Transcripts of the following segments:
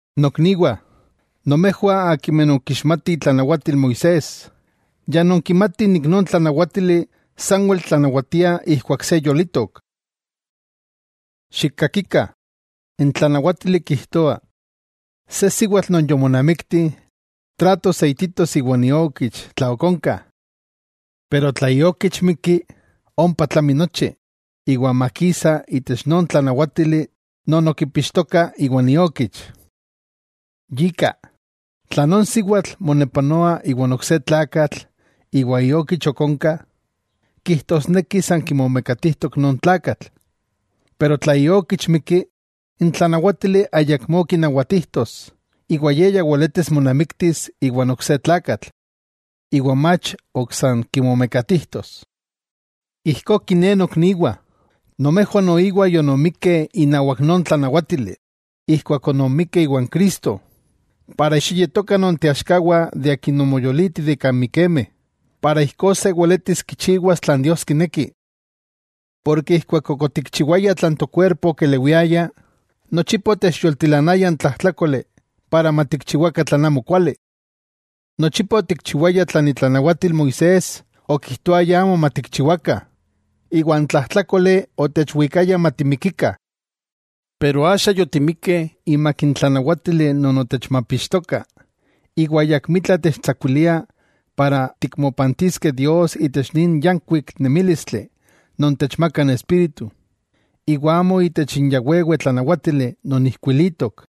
Nokniwah, nomejwah akimeh nonkixmatih itlanawatil Moisés, ya nonkimatih nik non tlanawátili sanwel tlanawatia ijkuak se yolitok. Xikkakikah, n tlanawátili kijtoa, se siwatl non yomonamikti trato seititos iwan iokich tla ok onka. Pero tla iokich mikki, ompa tlami nochi, iwa makisa itech non tlanawátili non okipixtoka iwan iokich. Yika, tla non siwatl monepanoa iwa ok se tlakatl iwa iokich ok onka, kijtosneki san kimomekatijtok non tlakatl. Pero tla iokich mikki, n tlanawátili ayakmó kinawatijtos iwa ye ya weletis monamiktis iwa n ok se tlakatl, iwa mach ok san kimomekatijtos. Ijkó kiné nokniwah, nomejwah noiwa yononmikkeh inawak non tlanawátili keman ononmikkeh iwan Cristo, para xiyetokah nonteaxkawah de Akin omoyoliti de kan mikemeh, para ijkó se weletis kichiwas tlan Dios kineki. Porke ijkuak ok otikchiwayah tlan tokuerpo okelewiaya, nochipa otechyoltilanaya n tlajtlákoli para matikchiwakah tlan amo kuali. Nochipa otikchiwayah tlan itlanawatil Moisés okijtoaya amo matikchiwakah, iwa n tlajtlákoli otechwikaya matimikikah. Pero axa yotimikkeh imak n tlanawátili non otechmapixtoka, iwa ayakmitla techtsakuilia para tikmopantiskeh Dios itech nin yánkuik nemílistli non techmaka n Espíritu, iwa amo itech n ya wewe tlanawátili non ijkuilitok.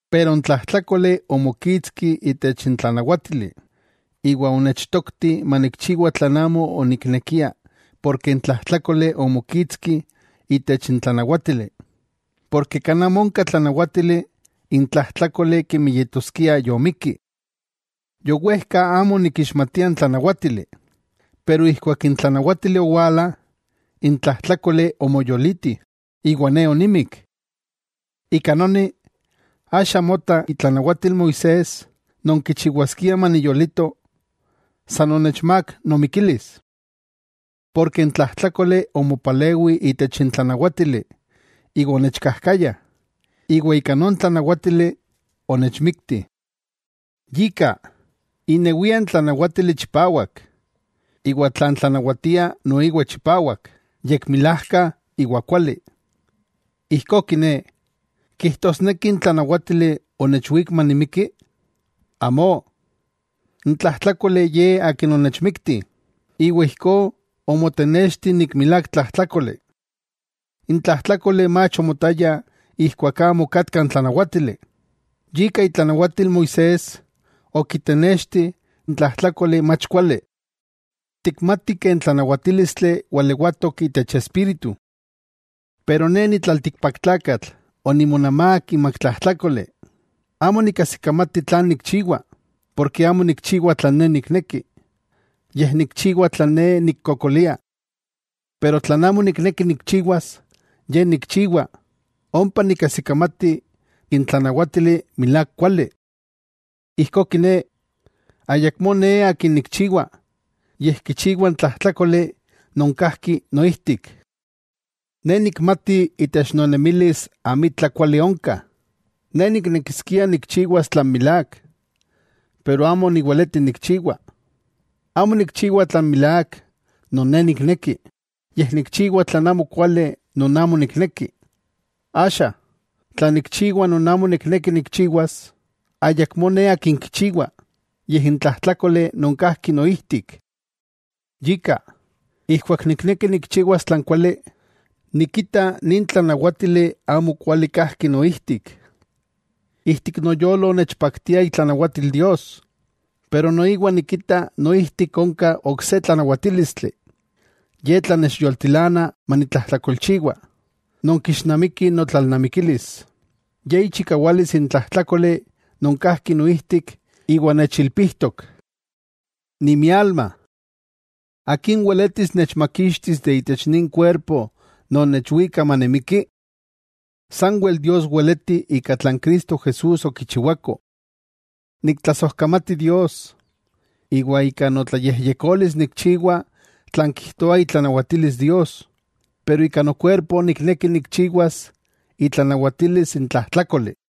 Pero n tlajtlákoli omokitski itech n tlanawátili, iwa onechtokti manikchiwa tlan amo oniknekia porke n tlajtlákoli omokitski itech n tlanawátili, porke kan amo onka tlanawátili n tlajtlákoli kemi yetoskia yomikki. Yowejka amo onikixmatia n tlanawátili, pero ijkuak n tlanawátili owala, n tlajtlákoli omoyoliti, iwa ne onimik. Ika noni, axa mota itlanawatil Moisés non kichiwaskia maniyolito, san onechmák nomikilis. Porke n tlajtlákoli omopalewi itech n tlanawátili iwa onechkajkaya, iwa ika non tlanawátili onechmikti. Yika, inewia n tlanawátili chipawak, iwa tlan tlanawatia noiwa chipawak, yekmilajka iwa kuali. Ijkó kiné, ¿kijtosneki n tlanawátili onechwík manimiki? ¡Amó! N tlajtlákoli ye akin onechmikti, iwa ijkó omotenexti nik milák tlajtlákoli. N tlajtlákoli mach omotaya ijkuak amo okatka n tlanawátili, yika itlanawatil Moisés okitenexti n tlajtlákoli mach kuali. Tikmatih n tlanawatílistli walewatok itech Espíritu. Pero ne ni tlaltikpaktlakatl onimonamák imak tlajtlákoli. Amo nikajsikamati tlan nikchiwa, porke amo nikchiwa tlan ne nikneki, yej nikchiwa tlan ne nikkokolia. Pero tlan amo nikneki nikchiwas, ye nikchiwa, ompa nikajsikamati n tlanawátili milák kuali. Ijkó kiné, ayakmó ne akin nikchiwa, yej kichiwa n tlajtlákoli non kajki noijtik. Ne nikmati itech nonemilis amitla kuali onka, ne niknekiskia nikchiwas tlan milák, pero amo niweleti nikchiwa. Amo nikchiwa tlan milák non ne nikneki, yej nikchiwa tlan amo kuali non amo nikneki. Axa, tla nikchiwa non amo nikneki nikchiwas, ayakmó ne akin kichiwa, yej n tlajtlákoli non kajki noijtik. Yika, ijkuak nikneki nikchiwas tlan kuali, nikita nin tlanawátili amo kuali kajki noijtik. Ijtik noyolo nechpaktia itlanawatil Dios, pero noiwa nikita noijtik onka ok se tlanawatílistli, ye tlan nechyoltilana manitlatlajkolchiwa, non kixnamiki notlalnamikilis, ye ichikawalis n tlajtlákoli non kajki noijtik iwa nechilpijtok. ¡Nimialma! ¿Akin weletis nechmakixtis itech nin kuerpo non nechwika manimiki? Sanwel Dios weleti ika tlan Cristo Jesús okichiwako. ¡Niktlasojkamati Dios! Iwa ika notlayejyekolis nikchiwa tlan kijtoa itlanawatilis Dios, pero ika nokuerpo nikneki nikchiwas itlanawatilis n tlajtlákoli.